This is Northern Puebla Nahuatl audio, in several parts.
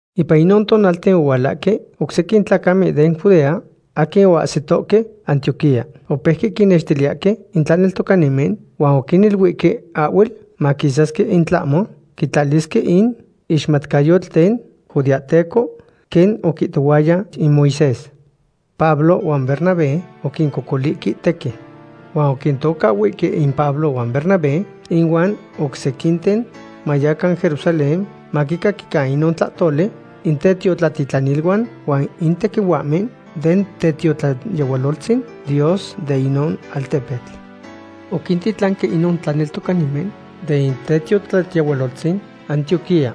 Ipan inon tonalten ohualahque oc sequin tlacamen den Judea aquin oahsitohque Antioquía. Opeuque quinnextiliyahque in tlaneltocanimen huan oquiniluihque ahhuel maquisasque in tlahmo quitlalisque in ixmatcayotl den judeahteco, quen oquihtohuaya in Moisés. Pablo huan Bernabé oquincocolihque tequin. Huan oquintocahhuihque in Pablo huan Bernabé ihuan oc sequinten, mayacan Jerusalén maquicaquican inon tlahtoli in tetiotlatitlaniluan huan in tequihuahmen den tetiotlayehualoltzin Dios de inon altepetl. Oquintitlanque inon tlaneltocanimen den tetiotlayehualoltzin Antioquía.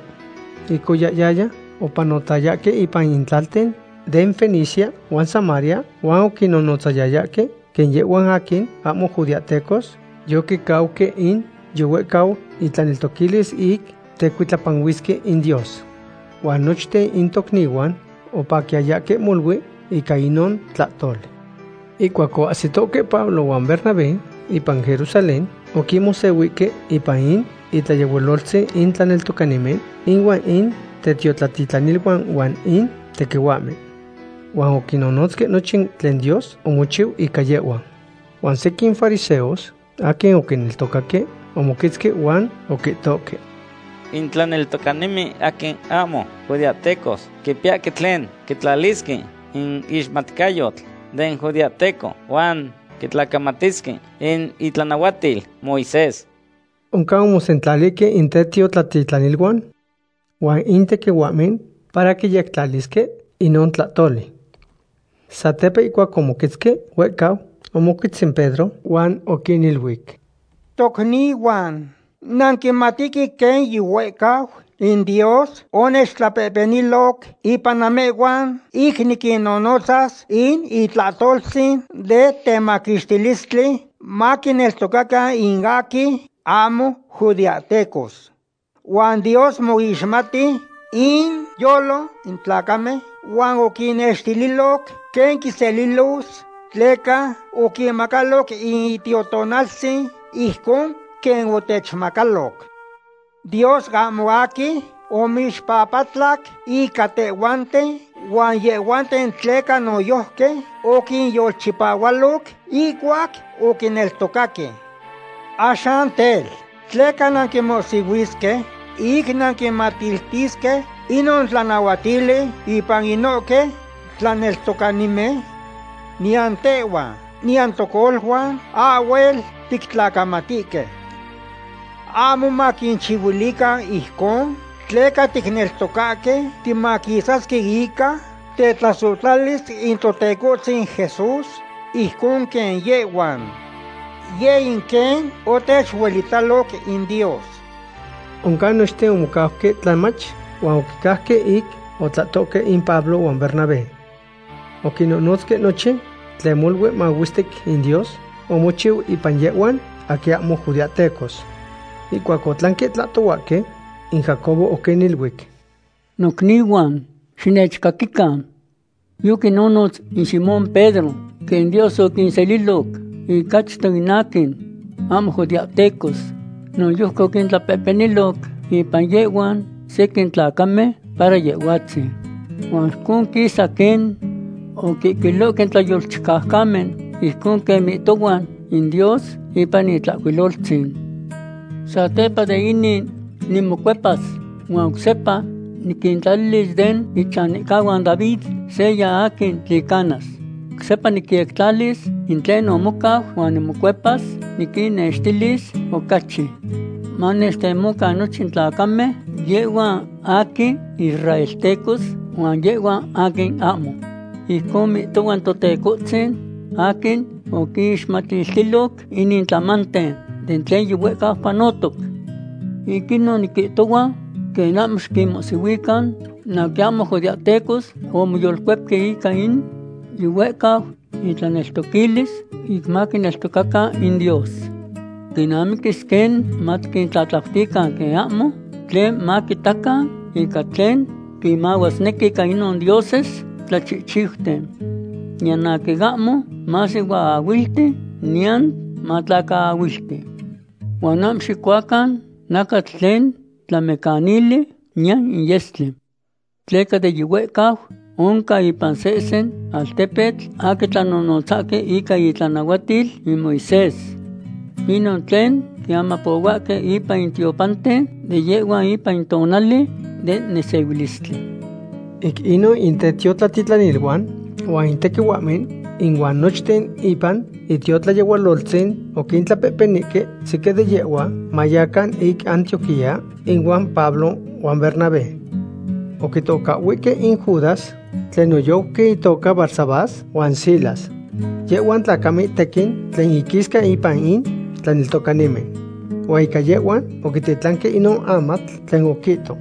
Ic oyahyaya, opanohtayahque ipan in tlalten den Fenicia huan Samaria, huan oquinnotzayayahque quen yehhuan aquin ahmo judeahtecos yoquicauque in yihuehcau intlaneltoquilis ic tecuitlapanuisque in Dios. Huan nochten in tocnihuan opaquiyayahque molui ica inon tlahtoli. Ihcuac oahsitohque Pablo huan Bernabé ipan Jerusalén, oquinmosehuihque ipan in itlayehualoltzin in tlaneltocanimen ihuan in tetiotlatitlaniluan huan in tequihuahmen. Huan oquinnonotzque nochin tlen Dios omochiu ica yehhuan. Huan sequin fariseos aquin oquineltocaque omoquetzque huan oquihtohque: ―In tlaneltocanimen aquin ahmo judeahtecos quipiyahque tlen quitlalisque in ixmatcayotl den judeahteco huan quitlacamatisque in itlanahuatil Moisés. Oncan omosentlalihque in tetiotlatitlaniluan huan in tequihuahmen para quiyectlalisque inon tlahtoli. Satepa ihcuac omononotzque huehcau, omoquetz in Pedro huan oquiniluic: ―Tocnihuan, nanquimatihque quen yihuehcau in Dios onechtlapehpeniloc ipan namehhuan ic niquinnonotzas in itlahtoltzin de temaquixtilistli maquineltocacan in aquin ahmo judeahtecos. Huan Dios moixmati inyolo in tlacamen huan oquinextililoc quen quinselilos tleca oquinmacaloc in Itiotonaltzin ijcon quen otechmacaloc. Dios ahmo aquin omoixpapatlac ica tehhuanten huan yehhuanten tleca noyojqui oquinyolchipahualoc ihcuac oquineltocaque. Axan tel, ¿tleca nanquinmohsihuisque ic nanquinmatiltisque inon tlanahuatili ipan inohque tlaneltocanimen? Niyan tehhuan niyan tocoluan ahhuel tictlacamatihque. Ahmo maquinchihuilican ijcon tleca ticneltocahque timaquisasque ica tetlasohtlalis in Totecohtzin Jesús ijcon quen yehhuan. Yeh in quen otechuelitalo in Dios. Oncan nochten omocauque tlamach, huan oquicajque ic otlahtohque in Pablo huan Bernabé. Oquinnonotzque nochin tlen molui mahuestic in Dios omochiu ipan yehhuan aquin ahmo judeahtecos. Ihcuac otlanque tlahtohuahque, in Jacobo oquiniluic: ―Nocnihuan, xinechcaquican. Yoquinonotz in Simón Pedro quen Dios oquinseliloc ic achto in aquin ahmo judeahtecos. Noyojqui oquitlapehpeniloc impan yehhuan sequin tlacamen para Yehhuatzin. Huan ijcon quisa quen oquihcuilohque in tlayolchicaucamen, ijcon quen mihtohua in Dios ipan in Itlahcuiloltzin: Satepa de inin nimocuepas huan oc sepa niquintlalilis den ichanihcahuan David seya aquin tlicanas. Oc sepa nicyectlalis in tlen omocau, huan nimocuepas niquinnextilis ocachi manechtemocan nochin tlacamen, yehhuan aquin israeltecos huan yehhuan aquin ahmo. Ijcon mihtohua in Totecohtzin aquin oquinixmatiltiloc inin tlamanten den tlen yihuehcau panotoc. ’Ic inon niquihtohua quen ahmo xiquinmohsihuican in aquin ahmo judeahtecos aquin omoyolcuepque ica in yihuehcau intlaneltoquilis ic maquineltocacan in Dios. Quinamiquis quen matiquintlahcuiluican quen ahmo tlen maquitacan ica tlen quimahuasnequi ica inon dioses tlachihchiuten. Niyan aquin ahmo masihuaahuilti niyan matlacaahuilti. Huan ahmo xicuacan nacatl tlen tlamecanili, niyan in yestli. Tleca de yihuehcau oncan ipan sehsen altepetl aquin tlanonotzahque ica itlanahuatil in Moisés. Inon tlen quiamapohuahque ipan in tiopanten de yehhuan ipan in tonali den nesehuilistli. Ic inon in tetiotlatitlaniluan, huan in tequihuahmen, ihuan nochten ipan itiotlayehualoltzin oquintlapehpenihque sequin de yehhuan, mayacan ic Antioquía ihuan Pablo huan Bernabé. Oquitocahhuihque in Judas tlen noyojqui itoca Barsabás, huan Silas. Yehhuan tlacamen tequin tlen inquisca ipan in tlaneltocanimen. Huan ica yehhuan oquititlanque inon amatl tlen oquihto: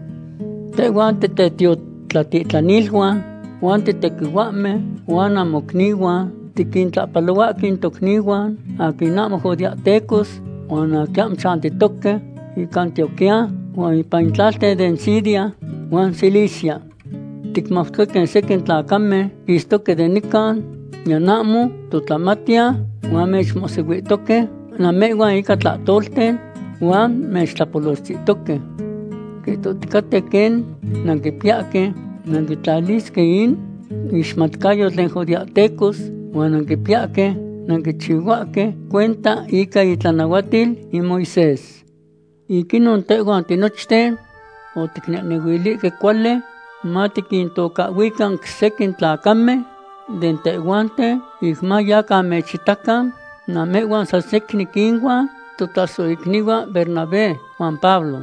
“Tehhuan titetiotlatitlaniluan huan titequihuahmen huan namocnihuan tiquintlahpalohuahque in tocnihuan aquin ahmo judeahtecos huan in aquin chantihque ic Antioquía huan ipan in tlalten den Siria huan Cilicia. Ticmautoque quen sequin tlacamen quistoque den nican, niyan ahmo totlamatiyan, huan mechmosihuihtohque namehhuan ica tlahtolten huan mechtlapolochtihtohque. Quihtohticaten quen nanquipiyahque nanquitlalisque in ixmatcayotl den judeahteco huan nanquipiyahque nanquichihuahque cuenta ica itlanahuatil in Moisés. Ic inon tehhuan tinochten oticnehnehuilihque cuali matiquintocahhuican sequin tlacamen de tehhuanten ic mayacan mechitacan namehhuan san secnin inuan totlasohicnihuan Bernabé huan Pablo.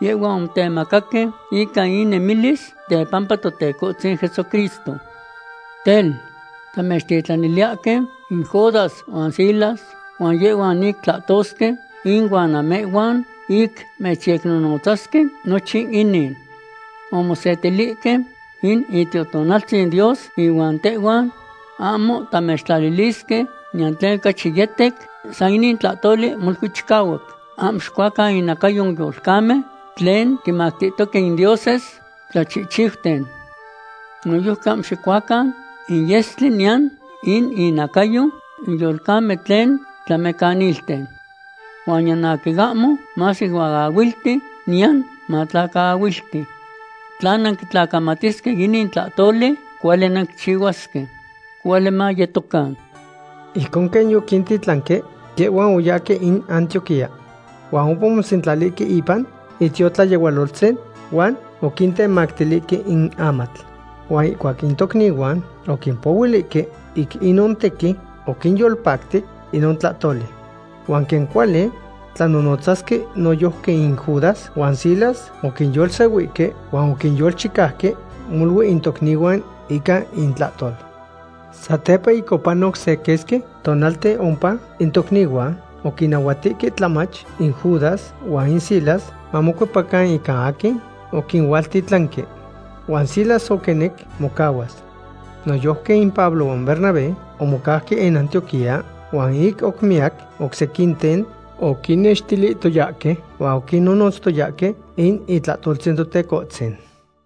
Yehhuan omotemacaque ica innemilis tepampa Totecohtzin Jesucristo. Tel, tamechtitlaniliyahque in Judas huan Silas, huan yehhuan ic tlahtosque ihuan namehhuan ic mechyecnonotzasque nochin inin. Omosetilihque in Itiotonaltzin Dios ihuan tehhuan ahmo tamechtlalilisque niyan tlen ocachi yetec, san inin tlahtoli molui chicahuac. Ahmo xicuacan inacayo in yolcamen tlen quinmactihtoque in dioses tlachihchiuten. Noyojqui ahmo xicuacan in yestli niyan in inacayo in yolcamen tlen tlamecanilten. Huan niyan aquin ahmo masihuaahuilti niyan matlacaahuilti. Tla nanquitlacamatisque inin tlahtoli, cuali nanquichihuasque. Cuali mayetocan.” Ijcon quen yoquintitlanque, yehhuan oyahque in Antioquía. Huan ompa omosentlalihque ipan itiotlayehualoltzin huan oquintemactilihque in amatl. Huan ihcuac in tocnihuan oquimpohuilihque, ic inon tequin oquinyolpactic inon tlahtoli. Huan quen cuali tlanonotzasque noyojqui in Judas huan Silas, oquinyolsehuihque huan oquinyolchicauque molui in tocnihuan ica intlahtol. Satepa ic panotoc se quesqui tonalten ompa, in tocnihuan oquinnahuatihque tlamach in Judas huan in Silas mamocuepacan ica aquin oquinualtitlanque. Huan Silas oquinec mocahuas. Noyojqui in Pablo huan Bernabé omocauque in Antioquía, huan ic oc miyac oc sequinten oquinnextilihtoyahque huan oquinnonotztoyahque in itlahtoltzin Totecohtzin.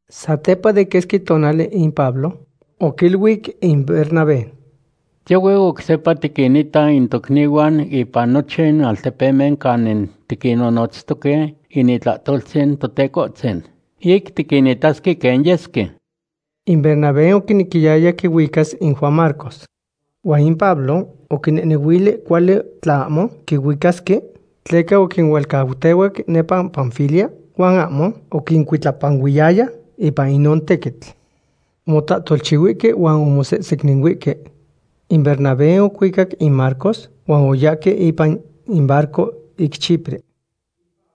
Satepa de quesqui tonali in Pablo oquiluic in Bernabé: ―Tiohue oc sepa tiquinita in tocnihuan ipan nochin altepemen canin tiquinnonotztoque in itlahtoltzin Totecohtzin, ic tiquinitasque quen yesque. In Bernabé oquinequiyaya quihuicas in Juan Marcos. Huan in Pablo oquinehnehuili cuali tla ahmo quihuicasque, tleca oquinualcautehuac nepa Panfilia huan ahmo oquincuitlapanuiyaya ipan inon tequitl. Omotlahtolchihuihque huan omosesecninuihque. In Bernabé oquihuicac in Marcos huan oyahque ipan in barco ic Chipre.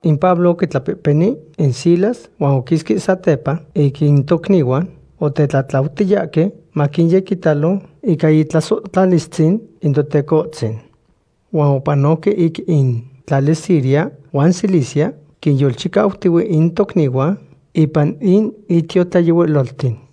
In Pablo oquitlapehpeni in Silas huan oquisque satepa ic in tocnihuan otetlatlautiyahque maquinyequitalo ica itlasohtlalistzin in Totecohtzin. Huan opanoque ic in tlali Siria huan Cilicia, quinyolchicautihue in tocnihuan ipan in itiotlayehualolten.